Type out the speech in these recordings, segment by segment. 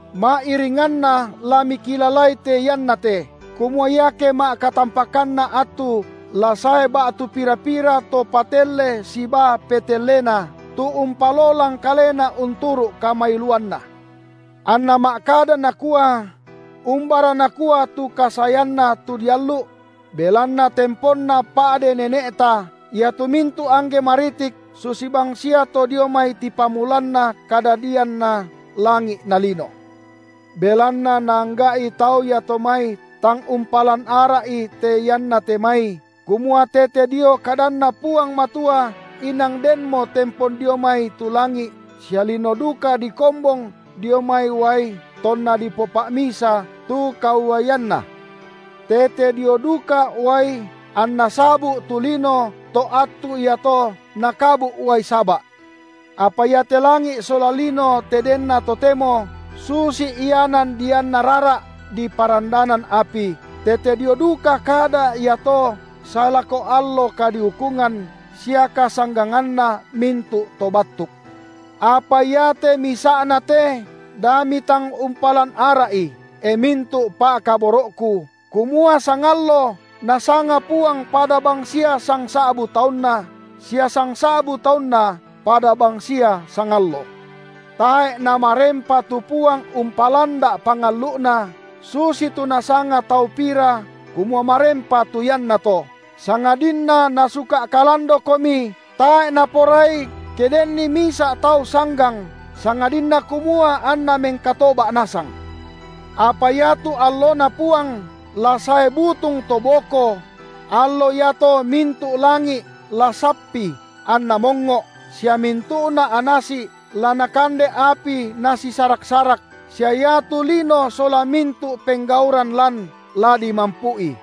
Ma’iringanna la mikilalai te iannate, kumua iake ma’katampakanna attu la sae ba’tu pira-pira to patelle sibaa petellena, tu umpalolang kalena unturu’ kamailuanna, anna ma’kada nakua: Umbara nakua tu kasaeanNa tu diallu’? belanna temponna pa’de nene’ta, iatu mintu’ angge maritik susi bang sia to dio mai tipamulanna kadadianna langi’ na lino. Belanna naangga’i tau iato mai tang umpalan ara’i te iannate mai, kumua tete dio kadanNa Puang Matua inang denmo tempon dio mai tu langi’ sia lino duka dikombong dio mai uai tonna dipopa’misa tu kauaianna. Tete dio duka uai anna sabu’ tu lino to attu iato nakabu’ uai saba’. Apa iate langi’ sola lino te denna totemo, susi ianan dianna rara’, diparandanan api, tete dio duka kada iato sae lako allo kadiukungan sia kasangganganna mintu’ to battuk. Apa iate misa’na te da mitang umpalan ara’i, e mintu’ pa’kaboro’ku, kumua sangallo Nasanga Puang pada bangsia sangsa’bu taunna sia sangsa’bu taunna pada bangsia sangallo. Tae’ Namarempa tu Puang umpalanda’ pangallu’Na, susitu nasanga tau pira kumua marempa tu iannato, sangadinna Nasuka’ kalandokomi, tae’ Naporai, ke denni misa’ tau sanggang, sangadinna kumua anna mengkatoba’ nasang. Apa iatu alloNa Puang la sae butung to boko; allo iato mintu’ langi’ la sappi anna mongngo’, sia mintu’na anasi’ la nakande api nasisarak-sarak, sia iatu lino sola mintu’ penggauran lan, la dimampu’i.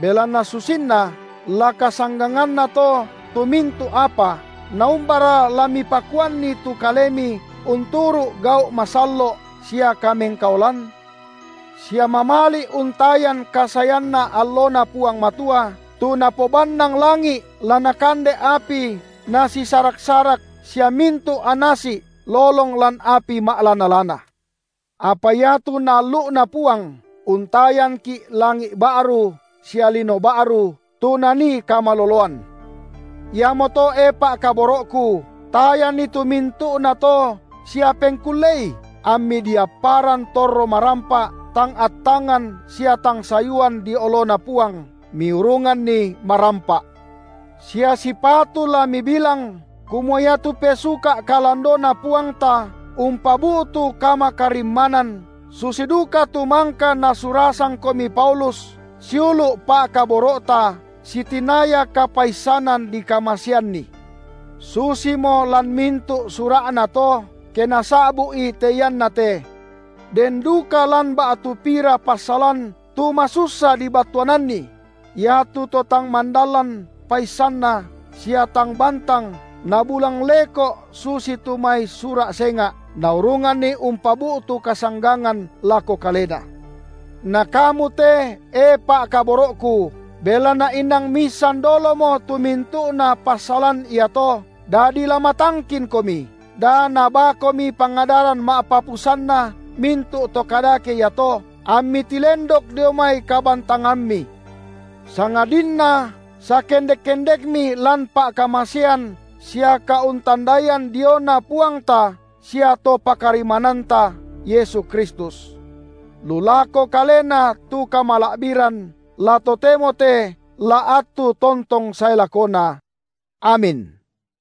Belanna susinna la kasangganganna to tu mintu’ apa, naumbara la mipakuanni tu kalemi unturu’ gau’ masallo’ sia kamengkaolan? Sia mamali’ untayan kasaeanna alloNa Puang Matua, tu napobannang langi’ la nakande api nasisarak-sarak sia mintu’ anasi’ lolong lan api ma’lana-lana. Apa iatu Naallu’na Puang, untayanki’ langi’ ba’ru sia lino ba’ru, tu nanii kamaloloan. Iamoto, e pa’kaboro’ku, tayanni tu mintu’nato sia pengkullei, ammi diapparan torro marampa’ tang attangan sia tang sayuan dio oloNa Puang, miurunganni marampa’. Sia sipatu la mibilang, kumua iatu pesuka’ kalandoNa Puangta umpabu’tu kamakarimmanan, susi duka tu mangka nasurasangkomi Paulus, siulu’ pa’kaboro’ta, sitinaya kapaissanan dikamaseanni. Susimo lan mintu’ sura’na to, ke nasa’bu’i te iannate. Den duka lan ba’tu pira passalan tu masussa dibattuananni; iatu to tang mandalan paissanna sia tang bantang nabulang leko’ susitu mai sura’ senga’, naurunganni umpabu’tu kasanggangan lako kalena. Na kamu te, e pa’kaboro’ku, belanna inang miissan dolomo tu mintu’na passalan iato, dadi la matangkinkomi, da nabaakomi pangadaran ma’papusanna mintu’ to kadake iato, ammi tilendok dio mai kabantangammi; sangadinna sakendek-kendekmi lan pa’kamasean sia kauntandaian diona Puangta sia To pakarimmananta, Yesu Kristus. Lu lako Kalena tu kamala’biran, la totemo te, la attu tontong sae lakona. Amin.